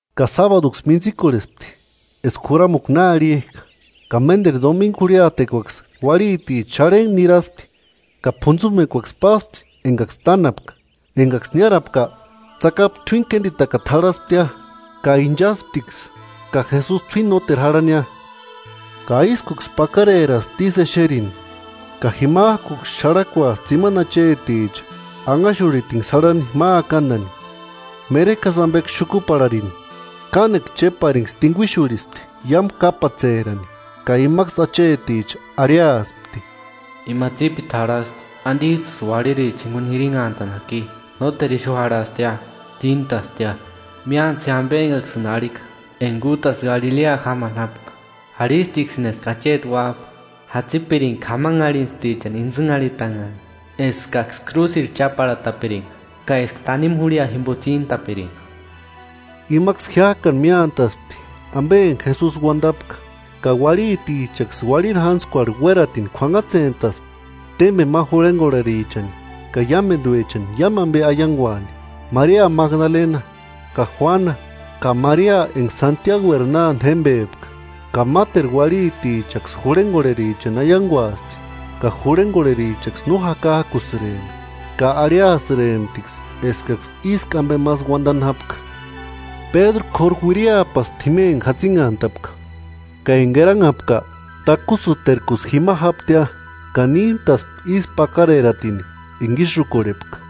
Ka sábaduksï mintsikorhespti eska juramukua na arhijka, ka ménderu domingu jurhiatekuaksï uarhiticha xarhentku niraspti ka p'untsumekuaksï páspti engaksï tánapka. Engaksï niárapka, tsakapu t'uíni kénditakata jarhasptia. Ka inchasptiksï ka Jesusi t'uíni nóteru jarhania. Ka ískuksï pakareraspti ísï exerini; ka jimajkuksï xarhakuaspti tsimani acheticha, anhaxurhitinksï jarhani ma akandani, meremerekjasï ambeksï xukuparharini. Kánekua chéparinksï tinguixurhispti iámu kápatserani; ka imaksï acheticha arhiaspti: –¿Ima tsípiti jarhasti, andijtsïsï uarhiriricha jinguni jirinhantani jaki? Nóteru ixu jarhastia, tsíntastia. Míantsï je ambe engaksïni arhika enga útasï Galilea jámani jápka; arhistiksïni eska acheti Uájpa jatsipiringa k'amanharhintstichani intsïnharhitanhani, eskaksï krúsirhu cháparhatapiringa ka eska tanimu jurhia jimbo tsíntapiringa. Imaksï jiájkani míantaspti ambe enga Jesusi uandapka, ka uarhitichaksï uarhiri jatsintskuarhu uératini k'uanhatsentaspti témbeni ma jurhengorherichani ka iámenduechani iámu ambe aianguani. Maria Magdalena ka Juana, ka Maria enga Santiagueri nánde jémbepka ka máteru uarhitichaksï jurhengorherichani aianguaspti. Ka jurhengorherichaksï no jakajkukuasïrempti, ka arhiasïremptiksï eskaksï ísku ambemasï uandani jápka. Pédru k'óru uiriapaspti jima enga jatsinhantapka; ka enga eranhapka, takusïterkusï jima jáptia. Ka níntaspti ísku pakareratini enga ísï úkorhepka.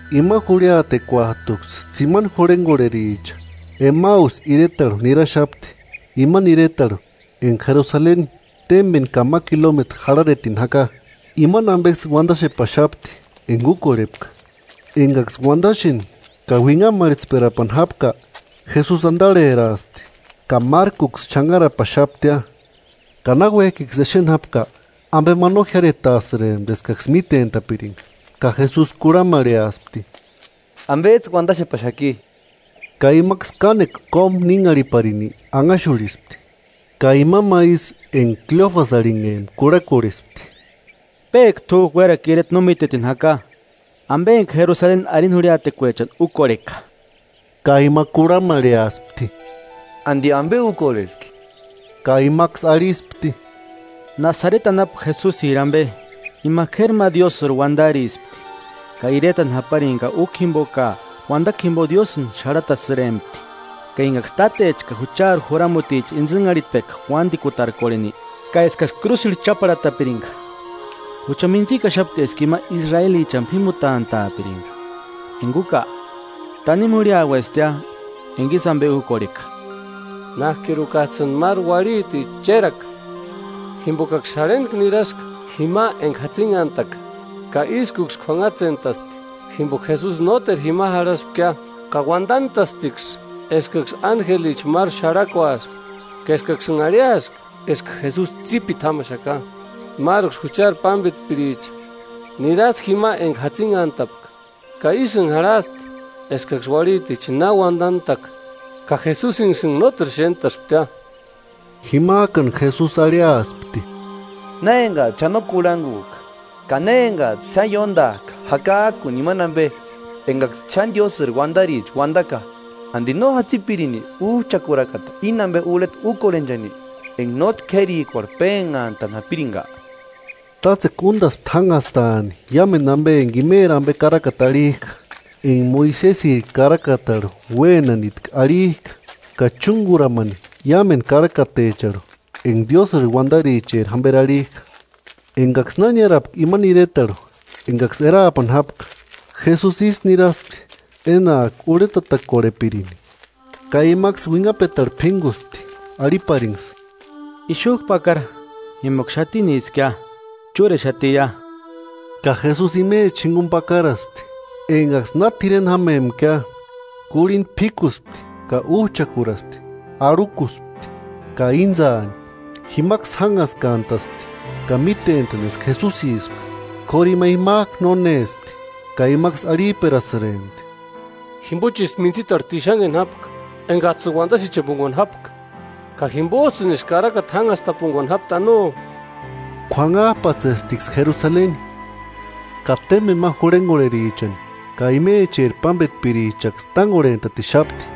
Ima jurhiatekuajtuksï tsimani jurhengorhericha Emausi iretarhu niraxapti, imani iretarhu enga Jerusalenini témbeni ka ma kilometru jarharetini jaka. Imani ambeksï uandaxepaxapti enga úkorhepka. Engaksï uandaxeni ka uinhamarhetsperapani jápka, Jesusi andarheraaspti ka márkuksï xanharapaxaptia. Ka náuejkiksï exeni jápka ambe ma no jiáretaasïrempti eskaksï mítentapiringa. Ka Jesusi kurhamarheaspti: –¿Ambejtsï uandaxepaxaki? Ka imaksï kánekua kómu ninharhiparini anhaxurhispti, ka ima ma isï enga Kleofasi arhinhempka kurhakorhespti: –¿Péka t'újku uérakua ireti no mítetini jaka ambe enga arini jurhiatekuechani Jerusaleni úkorheka? Ka ima kurhamarheaspti: –¿Andi ambe úkorheski? Ka imaksï arhispti: –Nasareti anapu Jesusiri ambe, ima k'éri ma Diósïri uandarispti ka iretani japarini ka úkua jimbo ka uandakua jimbo Diósïni xarhatasïrempti; ka engaksï tátecha ka juchari juramuticha intsïnharhitpeka uandikutarkorheni ka eskaksï krúsirhu cháparhatapiringa. Jucha mintsikaxapka eska ima Israelichani p'ímutantaapiringa. Enga úka, tanimu jurhiauestia enga ísï ambe úkorheka. Nájkirukajtsïni máru uarhiticha chéraka, jimbokaksï xarhentku niraska jima enga jatsinhantaka, ka ískuksï k'uanhatsentasti jimboka Jesusi nóteru jima jarhaspkia. Ka uandantastiksï eskaksï ánjelicha máru xarhakuaska ka eskaksïnha arhiaska eska Jesusi tsípiti jámaxaka. Máruksï juchari pámbetpiricha nirasti jima enga jatsinhantapka ka ísïnha jarhasti eskaksï uarhiticha na uandantaka, ka Jesusinksïnha nóteru xéntasptia. Jimajkani Jesusi arhiaspti: –¡Na engajtsï xáni no kurhangujka ka na engajtsï xáni ióndajka jakajkuni imani ambe engaksï xáni Diósïri uandaricha uandaka! ¿Andi no jatsipirini Újchakurakata íni ambe urheta úkorhenchani, enga nótki k'érikuarhu pénhantani japiringa? Tátsekua úndaspti jánhastaani iámendu ambe enga imeri ambe karakata arhijka, enga Moisesiri karakatarhu uénanitki arhijka ka chúnguramani iámendu karakatecharhu ka enga Diósïri uandaricheri jamberi arhijka. Engaksï na niárapka imani iretarhu engaksï eraapani jápka, Jesusi ísï niraspti énajki urhetatakorhepirini. Ka imaksï uinhapetarhu p'ínguspti arhiparinksï: –Ixujku pakara jimboka xatiniskia, chúrexatiia. Ka Jesusi imechani jinguni pakaraspti. Engaksï na t'ireni jámempkia kurhinda p'íkuspti ka újchakuraspti, arhukuspti ka íntsaani. Jimaksï jánhaskantaspti ka mítentani eska Jesusipka; kóru ima jimajku nónespti. Ka imaksï arhijperasïrempti: –Jimbochisï mintsitarhu tixanheni jápka engajtsïni uandaxechepunguani jápka, ka jimbojtsïnisï karakata jánhastapunguani jápti ¡Ano! K'uanhajpatsesptiksï Jerusaleni, ka témbeni ma jurhengorherichani ka imecheri pámbetpirichanksï tángorhentatixapti,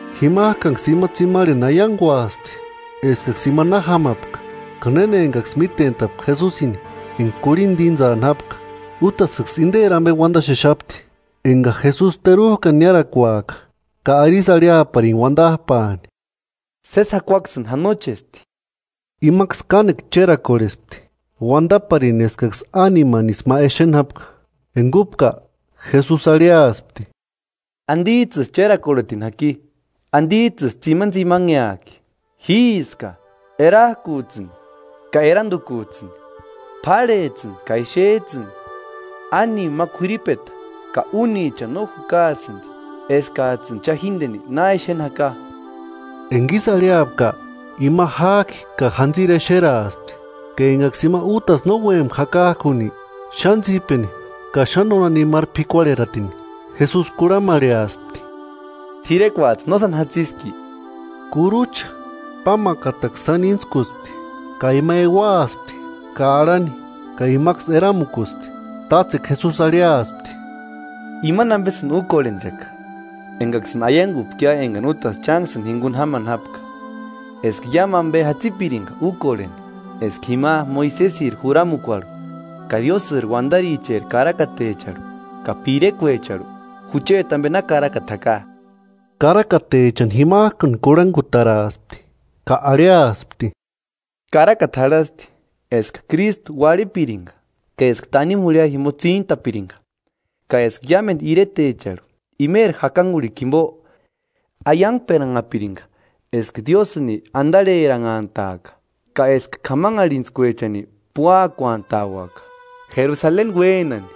Jimajkanksï ima tsimarheni aianguaspti eskaksï ima na jámapka, ka néna engaksï mítentapka Jesusini enga kurhinda íntsani jápka. Útasïksï inderi ambe uandaxexapti, enga Jesusi terujkani niárakuaaka ka arisï arhiaparini uandajpaani: –Sési jakuaksïni janochesti. Imaksï kánekua chérakorhespti, uandaparini eskaksï ánimanisï ma exeni jápka. Enga úpka Jesusi arhiaspti: –¿Andijtsïsï chérakorhetini jaki? ¿Andijtsïsï tsimanitsimanheajki? Jíska, erajkujtsïni ka erandukujtsïni, p'árhejtsïni ka exejtsïni: Ánima ma k'uiripeta ka únichani no jukaasïndi, eskajtsïni cha jíndeni na xéni jaka. Enga ísï arhiapka, ima jájki ka jantsiri exeraaspti. Ka engaksï ima útasï no úempka jakajkuni, xáni tsípeni ka xáni nónanimaru p'ikuarheratini, Jesusi kurhamarheaspti: –¿T'irekuajtsï no sáni jatsiski? Kurucha pámakataksï sáni íntskuspti, ka ima euaaspti ka arhani ka imaksï eramukuspti. Tátsekua Jesusi arhiaspti: –Imani ambesïni úkorhenchaka engaksïni aiangupkia engani útasï chánksïni jinguni jámani jápka: Eska iámu ambe jatsipiringa úkorheni eska jima Moisesiri juramukuarhu ka Diósïri uandaricheri karakatecharhu ka pirekuecharhu jucheti ambe na karakata jaka. Karakatechani jimajkani kurhangutaraaspti ka arhiaspti: –Karakata jarhasti eska Krístu uarhipiringa, ka eska tanimu jurhia jimbo tsíntapiringa, ka eska iámendu iretecharhu imeri jakanguarhikua jimbo aiangperanhapiringa eska Diósïni andarheranhantaaka, ka eska k'amanharhintskuechani púakuantauaka. Jerusaleni uénani,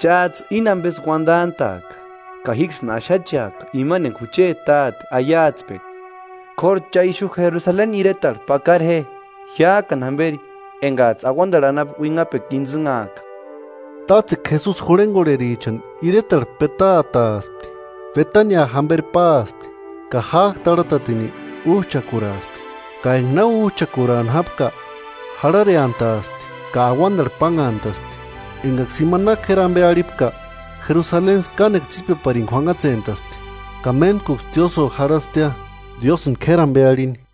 chájtsï íni ambesï uandantaaka. Ka jíksïni axacheaka imani enga jucheti Táte aiatspeka. K'óru cha ixu Jerusaleni iretarhu pakara je, jiájkani jamberi engajtsï auandarhu anapu uinhapekua intsïnhaaka. Tátsekua Jesusi jurhengorherichani iretarhu petaataaspti, Betania jamberi páaspti ka jájki tarhatatini újchakuraaspti. Ka enga na újchakuraani jápka jarhareantaaspti ka auandarhu pánhantaspti. Engaksï ima na k'éri ambe arhipka, Jerusaleniksï kánekua tsípeparini k'uanhatsentaspti. Ka méntkuksï tiósïo jarhasptia, Diósïni k'éri ambe arhini.